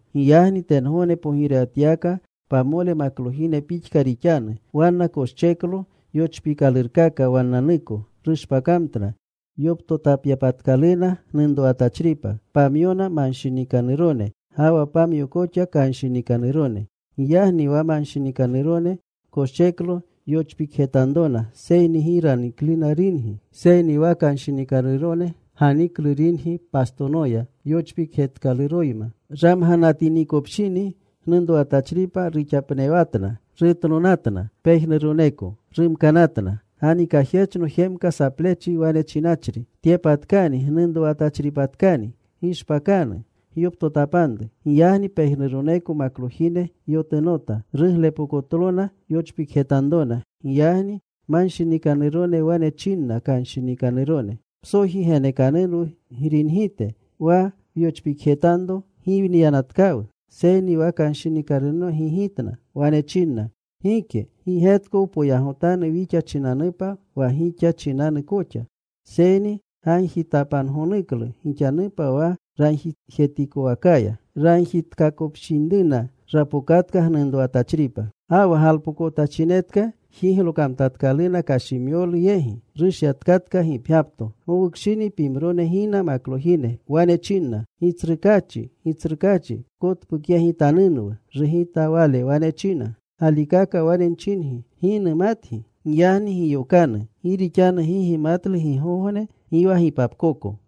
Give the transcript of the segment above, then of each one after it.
“Giyagni tengogne pogirewatyawaka pamole maklojine pixka rixanu. Wanna koscheklo yochpiikalurkaka wannanuko. Rushpakamtna yoptotapyapatkaluna gnunrowatachripa. Pamyona manshinikanurone, ga wa pamyo koxa kanshinikanurone. Giyagni wa manshinikanurone koscheklo yochpikjetanrona, seyni gi ranikluna ringi. Seyni wa kanshinikanurone ganiklu ringi pastonoya yochpikjetkaluroyma. Ramganatinikopshini gnunrowatachripa ruxapnewanatna, rutnonatna pejnuroneko. Rumkanatna. “Ganikajyechno jemka saplechi wane chinachri, ‘¡Tyepatkani! Gnunrowatachripatkani. Gishpakanu. Gyoptotapanru.’ “Giyagni pejnuroneko maklojine yotunota. Ruglepokotlona yochpikjetanrona. Giyagni manshinikanurone wane chinna kanshinikanurone, ‘Psoji genekanunwu gringite. Wa wyochpikjetanro giwniyanatkawu.’ “Seyni wa kanshinikanurone gigitna. Wane chinna, ‘Gike. Gi getko poyagotanu wixa chinanupa ga wa gixa chinanu koxa. Seyni gagjitapangonuklu gixanupa wa ragjijetikowakaya.’ “Ragjitapakopshinruna rapokatka gnunrowatachripa. Ga wa galpokonatachinetka jiglokamtatkaluna kashimyolu yegi. Rushyatkatka gipgyapto. “Gowukshini pimrone gina maklojine. Wane chinna, ‘Gitsrukaachi, gitsrukaachi, pkotpukyegitanunwu.’ “Rugita wale. Wane china, ‘Galikaka wane nchingi, gi numatgi.’ “Giyagni giyokanu. Gi rixanu gi gimatlu gigogne, gi wa gipapkoko.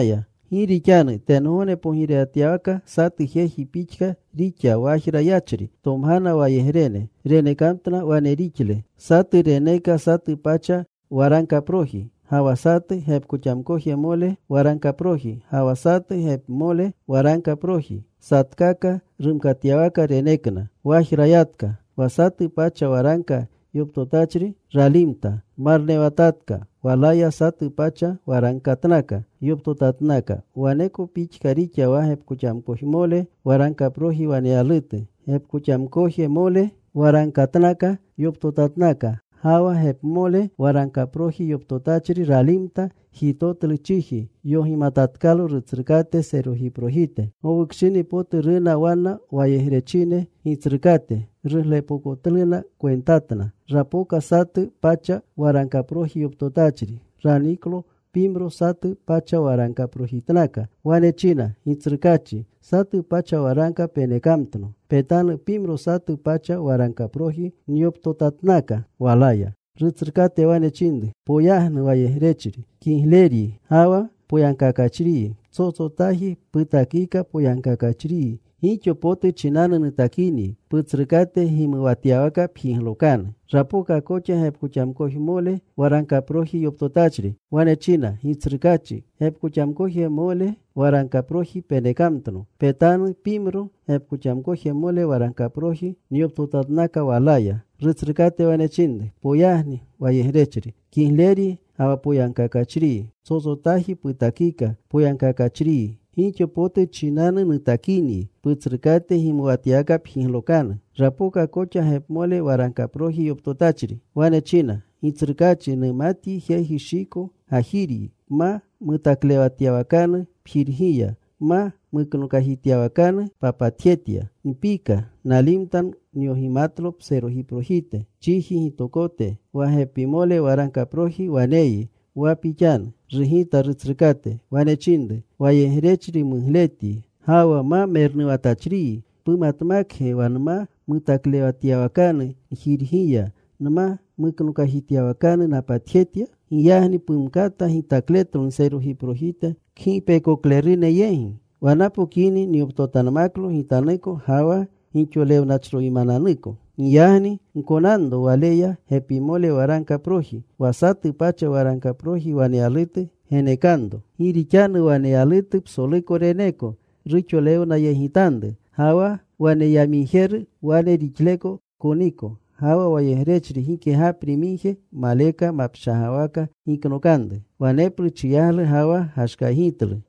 “Gi rixanu tengogne pogirewatyawaka satu jeji pixka rixa wajra yachri. Tomgana wayegrene. Renekamtna wane rixle. Satu reneka satu pacha waragkaproji, ga wa satu gepkoxamkojemole waragkaproji, ga wa satu gepmole waragkaproji. Satkaka rumkatyawaka renekna. Wajra yatka. Wa satu pacha waragka yoptotachri ralimta. Marnewatatka. Walaya satu pacha waragkatnaka yoptotatnaka. Waneko pixka rixa wa gepkoxamkojemole waragkaproji waneyalutu. Gepkoxamkojmole waragkatnaka yoptotatnaka. Ga wa gepmole waragkaproji yoptotachri ralimta. Jitotlu chiji. Yogimatatkalo rutsrukate serojiprojite. “Gowukshini potu runa wanna wayegrechine gitsrukate. Ruglepokotluna kwentatna. Rapoka satu pacha waragkaproji yoptotachri. Raniklo pimro satu pacha waragkaprojitnaka. Wane china, ‘Gitsrukaachi, satu pacha waragka penekamtno. Petanu. Pimro satu pacha waragkaproji nyoptotatnaka walaya.’ “Rutsrukate wane chinru, ‘Poyagnu, wayegrechri kigleryi ga wa poyagkakachriyi. Psotsotaji putakika poyagkakachriyi. Gixo potu chinanu nutakinyi. Putsrukate gimuwatyawaka pjiglokanu.’ “Rapoka koxa gepkoxamkojmole waragkaproji yoptotachri. Wane china, ‘Gitsrukaachi, gepkoxamkojmole waragkaproji penekamtno. Petanu. Pimro gepkoxamkojmole waragkaproji nyoptotatnaka walaya.’ “Rutsrukate wane chinru, ‘Poyagnu, wayegrechri kigleryi ga wa poyagkakachriyi. Psotsotaji putakika poyagkakachriyi. Gixo potu chinanu nutakinyi. Putsrukate gimuwatyawaka pjiglokanu.’ “Rapoka koxa gepimole waragkaproji yoptotachri. Wane china, ‘Gitsrukaachi, numatyi jeji shiko gajiryi. Pma mutaklewatyawakanu pjirgiya. Pma muknokajityawakanu papatjetya. Npika. Nalimta. Nyogimatlo pserojiprojite chiji gitokote, wa gepmole waragkaproji. Waneyyi wa pixanu.’ “Rugita rutsrukate. Wane chinru, ‘Wayegrechri mugletyi ga wa ma mernuwatachriyi. ¿Pumatmakge wa nma mutaklewatyawakanu njirgiya, nma muknokajityawakanu napatjetya? Giyagni pumkata gitakletlo nserojiprojite kgipekoklerune yegi, wa napokini nyoptotanmaklo gitanuko ga wa gixolewnachroymananuko.’ “ ‘Giyagni gkonanro waleya gepimole waragkaproji. Wa satu pacha waragkaproji waneyalutu genekanro. Gi rixanu waneyalutu psoluko reneeko. Ruxolewnayegitanru. Ga wa waneyamigjetu, wane rixleko koniko. Ga wa wayegrechri gike gapri migje maleka mapshagawaka giknokanru. Waneplu chiyaglu ga wa gashkaygitlu.’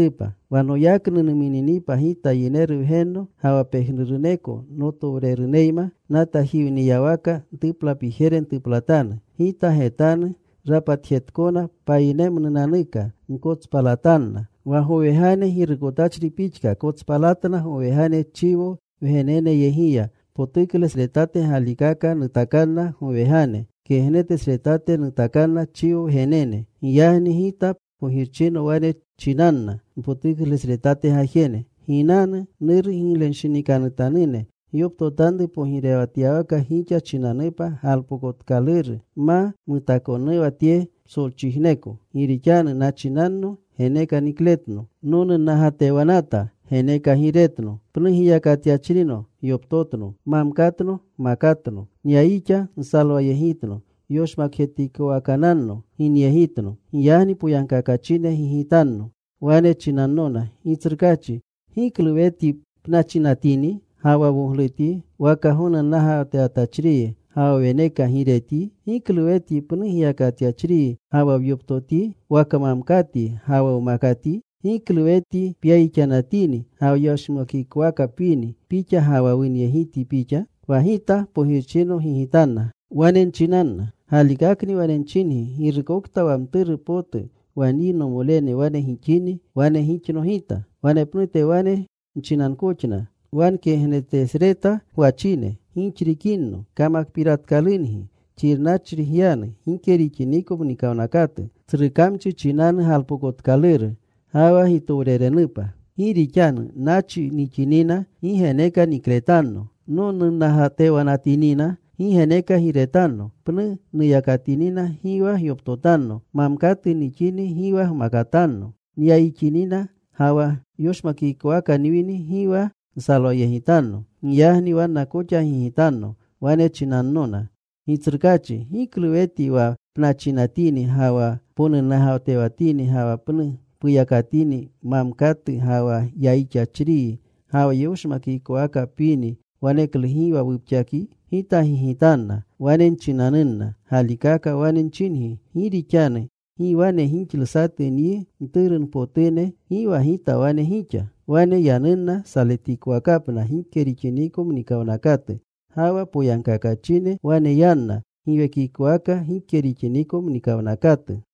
“Wa noyaknu numuninipa Gita wa Yineru Wgenno ga wa pejnuruneko notowreneyma, natajiwniyawaka ntuplapijere ntuplatanu. Gita getanu rapatjekaakona payinemnunanuka. Nkotspalatanna. Wa gowegane girukotachri pixka kotspalatna gowegane chiwo wgeneneyegiya. Potuklesretate galikaka nutakanna gowegane. Kegnetesretate nutakanna chiwo wgenene. “Giyagni Gita pogirchino wane nchinanna npotuklesretate gajene, ‘Ginanu, Nuru giglenshinikanutanune. Gyoptotanru pogirewatyawaka gixa chinanupa galpokotkaluru ma mutaakonuwa tye psolchijneko. Gi rixanu nachinanno. Geneka nikletno. Nonunnagatewanata. Geneka giiretno. Pnu giyakatyachrino. Gyoptotno. Mamkatno. Gmakatno. Nyayixa. Nsalwayegitno. Yoshmakjetikowakananno. Ginyegitno.’ “Giyagni poyagkakachine gigitanno. Wane chinannona, ‘Gitsrukaachi, ¿giklu wetyi pnachinatini ga wa woglutyi, waka gonunnagatewatachriyi ga wa weneka giiretyi? ¿Giklu wetyi pnu giyakatyachriyi ga wa wyoptotyi, waka mamkatyi ga wa wmakatyi? ¿Giklu wetyi pyayixanatini ga wa yoshmakikowaka pwini pixa, ga wa wunyegityi pixa?’ “Wa Gita pogirchino gigitanna. Wane nchinanna, ‘Galikakni wane nchingi, girukokta wa mturu potu wa nyi nomole wane gixini, wane gixno Gita.’ “Wanepnute wane nchinankoxna wa nkegnetesreta gwachine, ‘Gixrikinno, kamakpiratkalungi. Xirnachri gyanu gike rixiniko muwnakatu, tsru kamchi chinanu galpokotkaluru ga wa gitowrenenupa. Gi rixanu nachi nixinina, gi geneka nikletanno. Nonunnagatewanatinina, gi geneka giiretanno. Pnu nuyakatinina, gi wa gyoptotanno. Mamkatu nixini, gi wa gmakatanno. Nyayixinina ga wa yoshmakikowaka nwini, gi wa nsalwayegitanno.’ “Giyagni wanna koxa gigitanno. Wane chinannona, ‘Gitsrukachi, ¿giklu wetyi wa pnachinatini ga wa ponunnagatewatini ga wa pnu puyakatini, mamkatu, ga wa yayixachriyi ga wa yoshmakikowaka pwini, waneklu gi wa wupxakyi?’ “Gita gigitanna. Wane nchinanunna, ‘Galikaka wane nchingi, gi rixanu gi wane gixlu satu nyi mturpotune, gi wa Gita wane gixa.’ “Wane yanunna saletikowakapna gike rixiniko mnikawnakatu. Ga wa poyagkakachine wane yanna giwekikowaka gike rixiniko mnikawnakatu.”